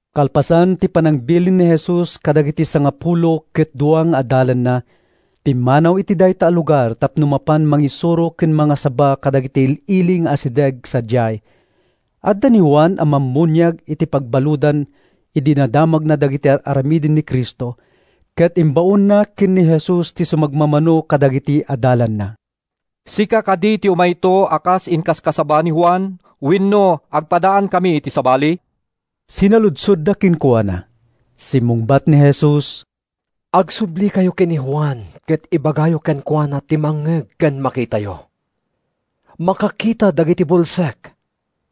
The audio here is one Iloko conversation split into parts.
Kalpasan ti panangbilin ni Jesus kadagiti sangapulo ket dua nga adalanna, pimmanaw iti dayta a lugar tapno mapan mangisuro ken mangasaba kadagiti il-ili nga asideg sadiay. Adda ni Juan a Mammuniag iti pagbaludan idi nadamagna dagiti ar-aramiden ni Cristo ket imbaonna ken ni Jesus ti sumagmamano kadagiti adalanna. “Sika kadi ti umayto a kas inkaskasaba ni Juan, wenno agpadaankami iti sabali?” sinaludsodda kenkuana. Simmungbat ni Jesus, “Agsublikayo ken ni Juan ket ibagayo kenkuana ti mangngeg ken makitayo: makakita dagiti bulsek,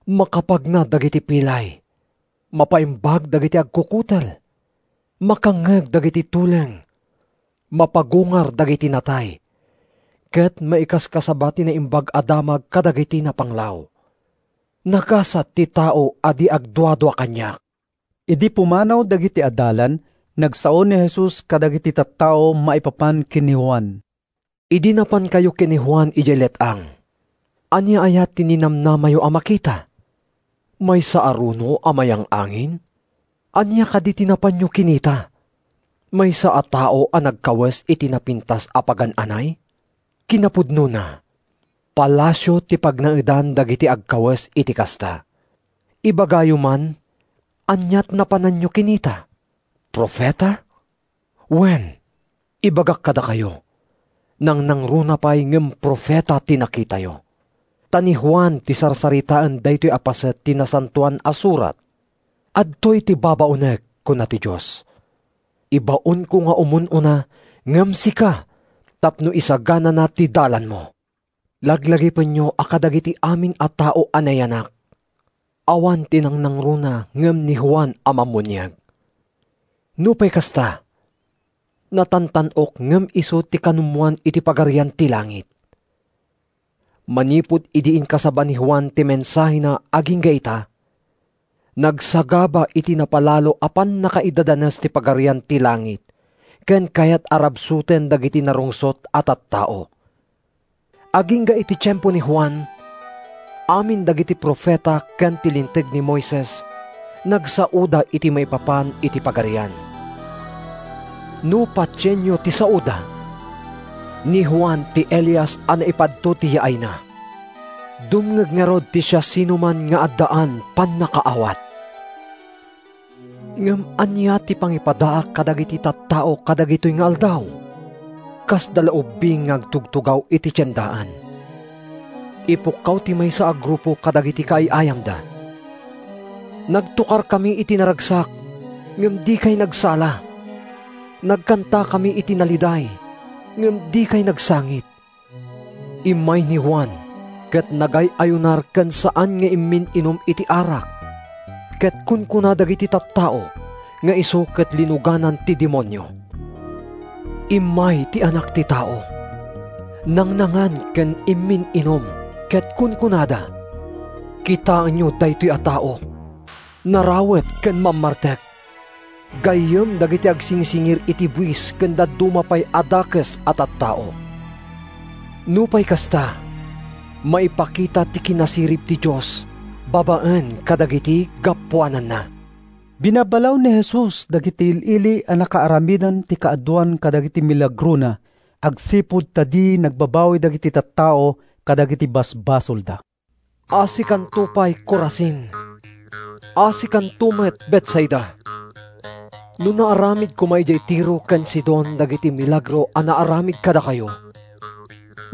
makapagna dagiti pilay, mapaimbag dagiti agkukutel, makangngeg dagiti tuleng, mapagungar dagiti natay, ket maikaskasaba ti Naimbag a Damag kadagiti napanglaw. Nagasat ti tao a di agduadua kaniak!” Idi pumanaw dagiti adalan, nagsao ni Jesus kadagiti tattao maipapan ken ni Juan, “Idi napankayo ken ni Juan idiay let-ang, ania aya ti ninamnamayo a makita? Maysa a runo a mayangin-angin? Ania kadi ti napanyo kinita? Maysa a tao a nagkawes iti napintas a pagan-anay? Kinapudnona, palasio ti pagnaedan dagiti agkawes iti kasta. Ibagayo man, ania ti napanyo kinita? Profeta? Wen, ibagak kadakayo, nangnangruna pay ngem profeta ti nakitayo. Ta ni Juan ti sarsaritaen daytoy a paset ti Nasantoan a Surat: ‘Adtoy ti babaonek, kuna ti Dios; Ibaonko nga umun-una ngem sika tapno isaganana ti dalanmo.’ Laglagipenyo a kadagiti amin a tao a nayanak, awan ti nangnangruna ngem ni Juan a Mammuniag. Nupay kasta, natantan-ok ngem isu ti kanumoan iti Pagarian ti Langit. Manipud idi inkasaba ni Juan ti mensahena agingga ita, nagsagaba iti napalalo a pannakaidadanes ti Pagarian ti Langit ken kayat a rabsuten dagiti narungsot a tattao. Agingga iti tiempo ni Juan, amin dagiti profeta ken ti Linteg ni Moises nagsaoda iti maipapan iti Pagarian. No patienyo ti saoda, ni Juan ti Elias a naipadto ti yaayna. Dumngeg ngarud ti siasinoman nga addaan pannakaawat. “Ngem ania ti pangipadaak kadagiti tattao kadagitoy nga aldaw? Kasda la ubbing nga agtugtugaw iti tiendaan. Ipukkaw ti maysa a grupo kadagiti kaay-ayamda: ‘Nagtokarkami iti naragsak, ngem dikay nagsala. Nagkantakami iti naliday, ngem dikay nagsangit!’ “Immay ni Juan ket nagay-ayunar ken saan nga immin-inum iti arak, ket kunkuna dagiti tattao nga isu ket linuganan ti demonio. “Immay ti Anak ti Tao, nangnangan ken immin-inum, ket kunkunada, ‘Kitaenyo daytoy a tao, narawet ken mammartek, gayyem dagiti agsingsingir iti buis ken dadduma pay a dakes a tattao!’ Nupay kasta, maipakita ti kinasirib ti Dios babaen kadagiti gapuananna.” Binabalaw ni Jesus dagiti il-ili a nakaaramidan ti kaaduan kadagiti milagrona agsipud ta di nagbabawi dagiti tattao kadagiti basbasolda. “Asikanto pay, Corazin! Asikanto met, Betsaida! No naaramid koma idiay Tiro ken Sidon dagiti milagro a naaramid kadakayo,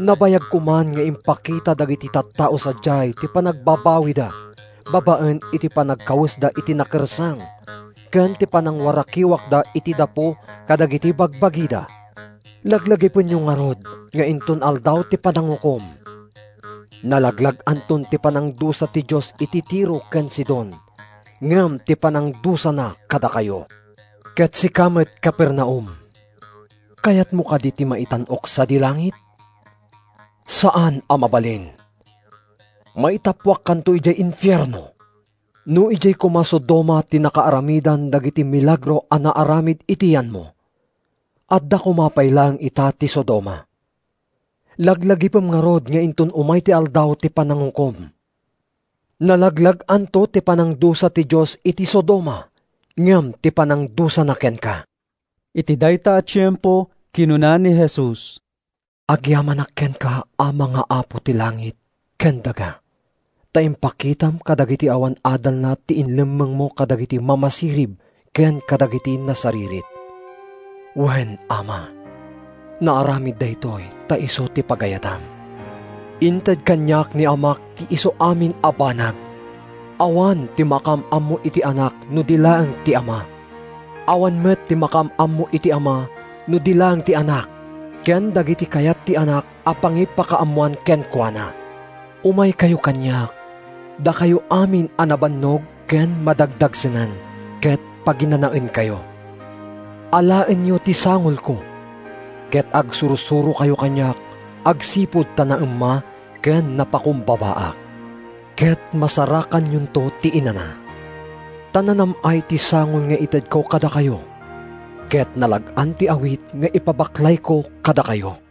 nabayag koman nga impakita dagiti tattao sadiay ti panagbabawida babaen iti panagkawesda iti nakersang ken ti panangwarakiwakda iti dapu kadagiti bagbagida. Laglagipenyo ngarud nga inton Aldaw ti Panangukom, nalaglag-anto ti panangdusa ti Dios iti Tiro ken Sidon ngem ti panangdusana kadakayo. “Ket sika met, Capernaum, kayatmo kadi ti maitan-ok sadi langit? Saan a mabalin! Maitappuakkanto idiay infierno! No idiay koma Sodoma ti nakaaramidan dagiti milagro a naaramid iti yanmo, adda koma pay laeng ita ti Sodoma. Laglagipem ngarud nga inton umay ti Aldaw ti Panangukom, nalaglag-anto ti panangdusa ti Dios iti Sodoma ngem ti panangdusana kenka.” Iti dayta a tiempo, kinuna ni Jesus, “Agyamanak kenka, Ama nga Apo ti langit ken daga, ta impakitam kadagiti awan adalna ti inlemmengmo kadagiti mamasirib ken kadagiti nasaririt. Wen, Ama, naaramid daytoy ta isu ti pagayatam. “Inted kaniak ni Amak ti isuamin a banag. Awan ti makaam-ammo iti Anak no di laeng ti Ama. Awan met ti makaam-ammo iti Ama no di laeng ti Anak ken dagiti kayat ti Anak a pangipakaammoan kenkuana. “Umaykayo kaniak, dakayo amin a nabannog ken madagdagsenan, ket paginanaenkayo. Alaenyo ti sangolko, ket agsursurokayo kaniak agsipud ta naemma ken napakumbabaak, ket masarakanyonto ti inana. Ta nanam-ay ti sangol nga itedko kadakayo, ket nalag-an ti awit nga ipabaklayko kadakayo.”